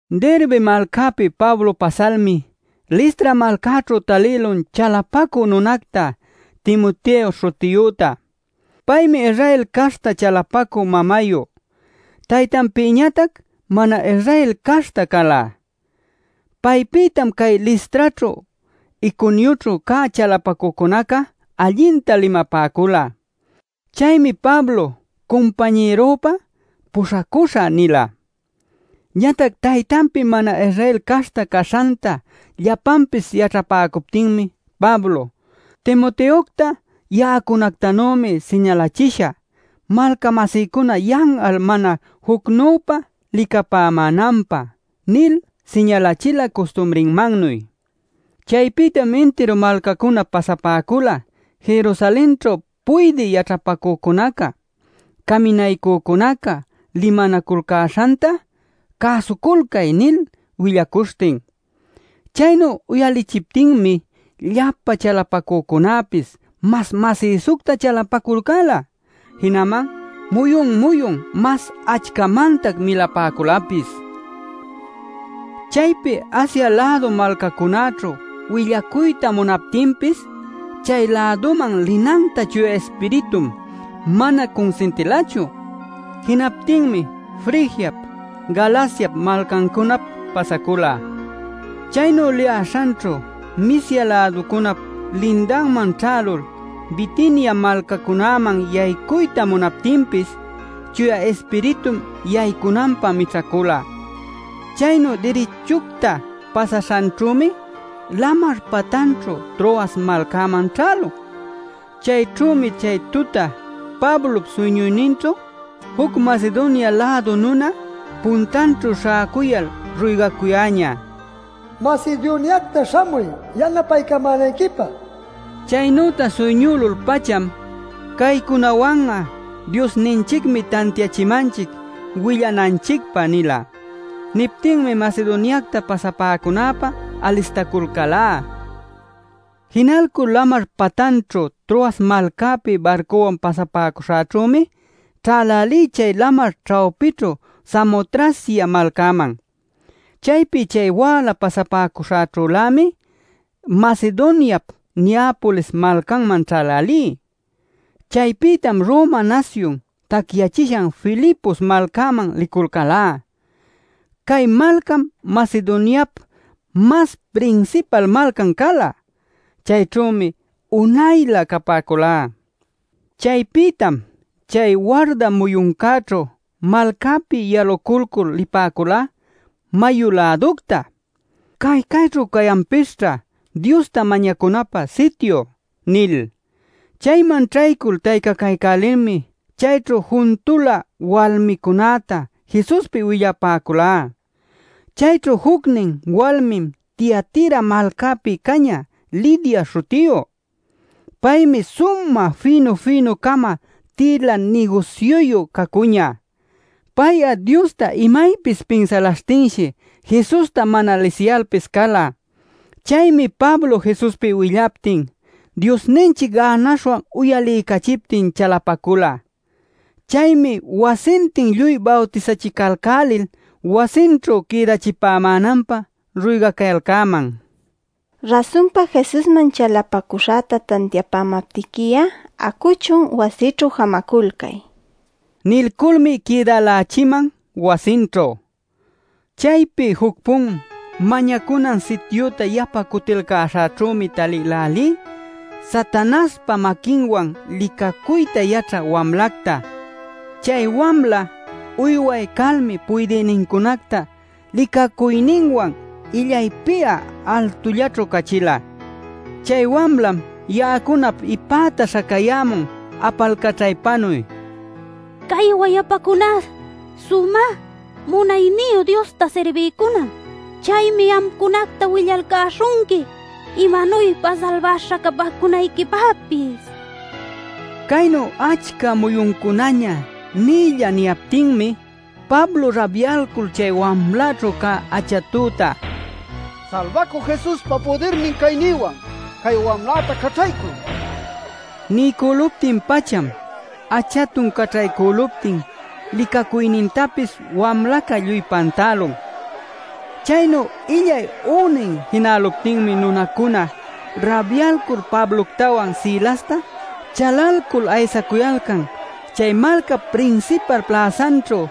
Derbe malcäpi Pablo pasalmi Listra malcäćhu talïlun chalapacü nunacta Timoteo śhutiyüta. Paymi Israel caśhta chalapacü mamayu, taytanpïñatac mana-Israel caśhta cala. Paypïtam cay Listraćhu, Iconioćhu cä chalapacücunaca allinta limapäcula. Chaymi Pablo cumpañïrunpä “puśhacuśhä” nila. Ñatac taytanpi mana-Israel caśhta caśhanta llapanpis yaćhapäcuptinmi Pablo: “Timoteocta ya'acunactanümi siñalachishä malca-masïcuna yan'al mana jucnüpa licapämänanpä” nil siñalachila custumrinmannuy. Chaypïtam intiru malcacunap pasapäcula Jerusalenćhu puydï yaćhapacücunaca, caminaycücunaca limanaculcäśhanta “cäsuculcay” nil willacuśhtin. Chaynu uyalichiptinmi llapa chalapacücunäpis mas masïsucta chalapaculcäla. Jinaman muyun-muyun mas achcamantac milapäculapis. Chaypi Asia-lädu malcacunäćhu willacuyta munaptinpis chay-läduman linanta Chuya Ispiritum mana cunsintilachu. Jinaptinmi Frigiap, Galaciap malcancunap pasacula. Chaynu liyäśhanćhu Misia-läducunap lindanman ćhälul Bitinia malcacunäman yaycuyta munaptinpis Chuya Ispiritum yaycunanpä mićhacula. Chaynu dirichucta pasaśhanćhümi lamar patanćhu Troas malcäman ćhälun. Chayćhümi chay tuta Pablop suyñuyninćhu juc Macedonia-lädu nuna puntanćhu śhäcuyal ruygacuyäñä “Macedoniacta śhamuy, yanapaycamänayquipä” nil. Chaynüta suyñülul-pacham “Caycunawan'a Diosninchicmi tantiachimanchic willananchicpä” nila. Niptinmi Macedoniacta pasapäcunäpä alistaculcälá. Jinalcul lamar patanćhu Troas malcäpi barcuwan pasapäcuśhäćhümi ćhälälí chay lamar ćhawpićhu Samotracia malcäman. Chaypi chay wäla pasapäcuśhäćhülämi Macedoniap Neapolis malcanman ćhälälí. Chaypïtam Roma nasyun tacyachishan Filipos malcaman liculcälá. Cay malcam Macedoniap mas prinsipal malcan cala. Chayćhümi unaylä capäculá. Chaypïtam chay warda muyuncäćhu malcäpi yaluculcul lipäculá mayu-läducta “Cay cayćhu cayanpisćha Diosta mañacunapä sityup” nil. Chayman ćhaycul taycacaycälilmi chayćhu juntula walmicunäta Jesuspi willapäculá. Chayćhu jucnin walmim Tiatira malcapi cañä Lidia śhutiyu. Paymi sumä fïnu-fïnu-cama tïla nigusyuyu cacuñä. Pay'a Diosta imaypis pinsalaśhtinshi Jesusta mana lisiyalpis cala. Chaymi Pablo Jesuspi willaptin Diosninchic gänaśhwan uyaliycachiptin chalapacula. Chaymi wasintin lluy bawtisachicälälil wasinćhu quïdachipämänanpä ruygacayalcäman: “Rasunpa Jesusman chalapacuśhäta tantiapämaptiqui'a, acuchun, wasïćhu jamaculcay” nil. Nilculmi quïdälächiman wasinćhu. Chaypi juc-pun mañacunan sityüta yapa cutilcäśhäćhümi talïlälí Satanaśhpa maquinwan licacuyta yaćhä wamlacta. Chay wamla uyway calmi puydïnincunacta licacuyninwan illaypi'a altullaćhu cachila. Chay wamlam ya'acunap ipäta śhacayämun apalcaćhaypanuy: “Cay wayapacuná Sumä Munayniyu Diosta sirbïcunam. Chaymi amcunacta willalcäśhunqui imanuypa salbaśha capäcunayquipäpis” nishtin. Caynu achca muyuncunaña nïlla niyaptinmi Pablo rabyalcul chay wamlaćhu cä achatüta: “¡Salbacü Jesuspa pudirnin caynïwan cay wamläta caćhaycuy!” niycülun. Niycüluptin-pacham achatun caćhaycüluptin licacuynintapis wamlaca lluy pantälun. Chaynu illay ünin jinäluptinmi nunancuna rabyälul Pabloctawan Silasta chalalcul aysacuyalcan chay malcap prinsipal pläsanćhu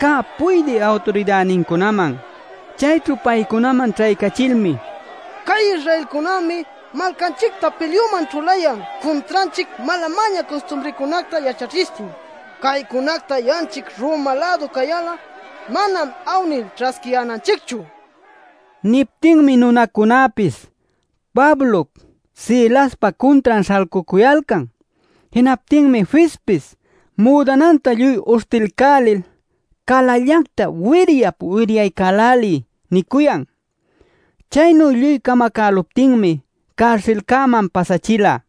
cä puydï awturidänincunäman. Chayćhu paycunaman ćhaycachilmi: “Cay Israelcunämi malcanchicta pilyuman ćhulayan cuntranchic mala-mäña custumricunacta yaćhachishtin. Caycunacta ya'anchic Roma-lädu cayal'a manam awnil ćhasquiyänanchicchu” nicuyalcan. Niptinmi nunacunäpis Pablop Silaspa cuntran śhalcucuyalcan. Jinaptinmi fispis: “Müdananta lluy uśhtilcälil calallacta wiryap wiryaycäläliy” nicuyan. Chaynu lluy camacalcuptinmi carsilcäman pasachila.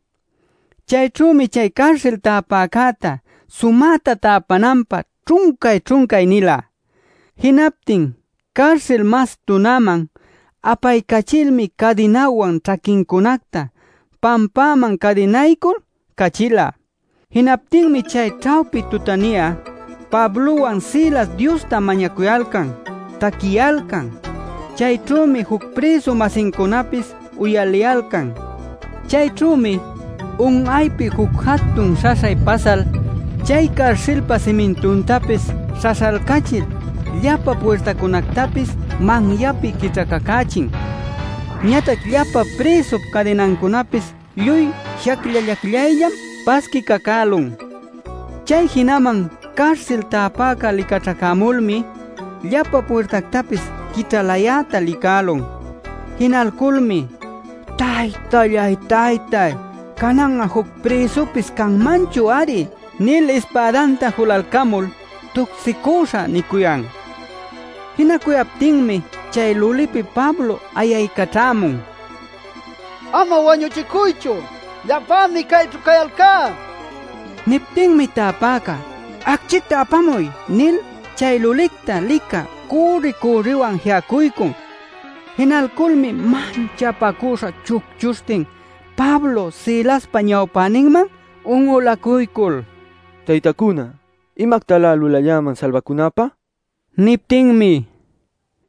Chayćhümi chay carsil täpäcäta sumäta täpananpä ćhuncay-ćhuncay nila. Jinaptin carsil mas tunäman apaycachilmi cadinawan ćhaquincunacta pampäman cadinaycul cachila. Jinaptinmi chay ćhawpi tutani'a Pablowan Silas Diosta mañacuyalcan, taquiyalcan. Chayćhümi juc prïsu-masincunapis uyaliyalcan. Chayćhümi un'aypi juc jatun śhaśhay pasal chay carsilpa simintuntapis śhaśhalcachil llapa puirtancunactapis manyapi quićhacacächin. Ñatac llapa prïsup cadinancunapis lluy shacllallacyayllam pasquicacülun. Chay jinaman carsil täpäca licaćhacämulmi, llapa puirtactapis quićhalayäta licälun. Jinalculmi “Taytallay-taytay, canan'a juc prïsupis canmanchu-ari” nil ispädanta julalcamul “tucsicüśhä” nicuyan. Jinacuyaptinmi chay lulipi Pablo ayaycaćhämun: “¡Ama wañuchicuychu! ¡Llapämi cayćhu cayalcá!” nil. Niptinmi täpäca “¡Acchicta apamuy!” nil chay lulicta licä cürri-cürriwan ji'acuycun. Jinalculmi manchapacüśha chucchuśhtin Pablop Silaspa ñawpäninman un'ulacuycul: “Taytacuna, ¿imactalä lulalläman salbacunäpä?” nicuyan. Niptinmi: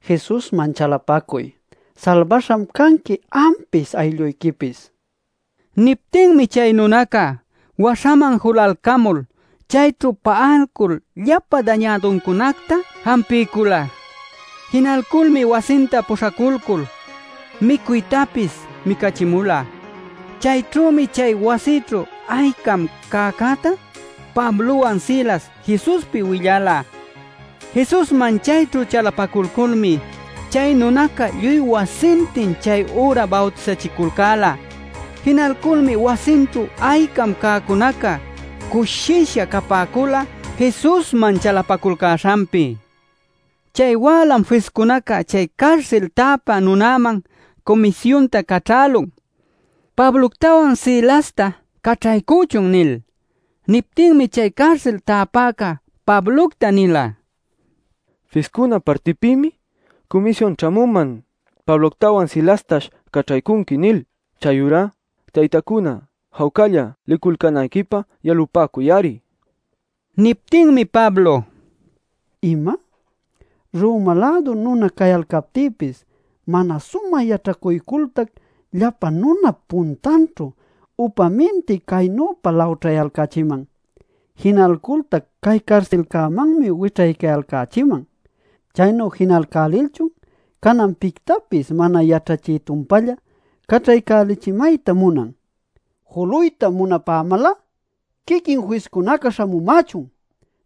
“Jesusman chalapacuy; salbaśham canqui ampis aylluyquipis” nipäcula. Niptinmi chay nunaca waśhaman julalcamul chayćhu pa'aycul llapa dañäduncunacta jampiycula. Jinalculmi wasinta puśhaculcul micuytapis micachimula. Chayćhümi chay wasićhu aycam cäcäta Pablowan Silas Jesuspi willala. Jesusman chayćhu chalapaculculmi chay nunaca lluy wasintin chay üra bawtisachiculcäla. Jinalculmi wasinćhu aycam cäcunaca cushisha capäcula Jesusman chalapaculcäśhanpi. Chay wälam fiscunaca chay carsil täpä nunäman cumisyunta caćhälun: “Pabloctawan Silasta caćhaycuchun” nil. Niptinmi chay carsil täpäca Pablocta nila: “Fiscuna partipïmi cumisyun ćhämuman ‘Pabloctawan Silastash caćhaycunqui’ nil; chayurá, taytacuna, jawcalla liculcänayquipä yalupäcuy-ari” nin. Niptinmi Pablo: “¿Ima? Roma-lädu nuna cayalcaptïpis mana sumä yaćhacuycultac llapa nunap puntanćhu upaminti caynüpa lawćhayalcächiman. Jinalcultac cay carsilcämanmi wićhaycayalcächiman. Chaynu jinalcälilchun canan pictapis mana yaćhachï-tumpalla caćhaycälichimayta munan. Juluyta munapämal'a quiquin fiscunaca śhamumächun,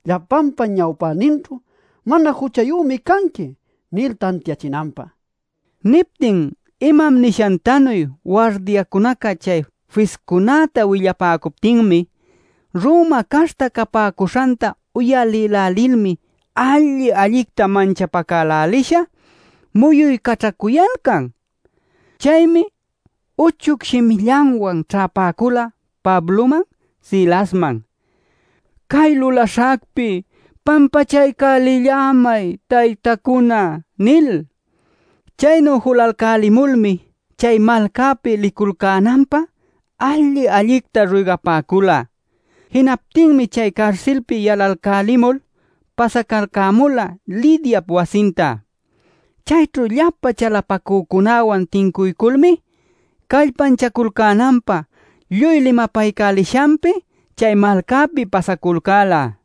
llapanpa ñawpäninćhu ‘Mana juchayümi canqui’ nil tantiachinanpä” nin. Niptin imam nishantanuy wardiacunaca chay fiscunäta willapäcuptin Roma caśhta capäcuśhanta uyalïlälilmi alli-allicta manchapacälälisha muyuycaćhacuyalcan. Chaymi uchuc shimillanwan ćhäpäcula Pabloman, Silasman “Cay lulaśhacpi pampachaycälillämay, taytacuna” nil. Chaynu julalcälimulmi chay malcapi liculcänanpä alli-allicta ruygapäcula. Jinaptinmi chay carsilpi yalalcälimul pasacalcämula Lidiap wasinta. Chayćhu llapa chalapacücunäwan tincuyculmi, callpanchaculcänanpä lluy limapaycälishanpi chay malcäpi pasaculcäla.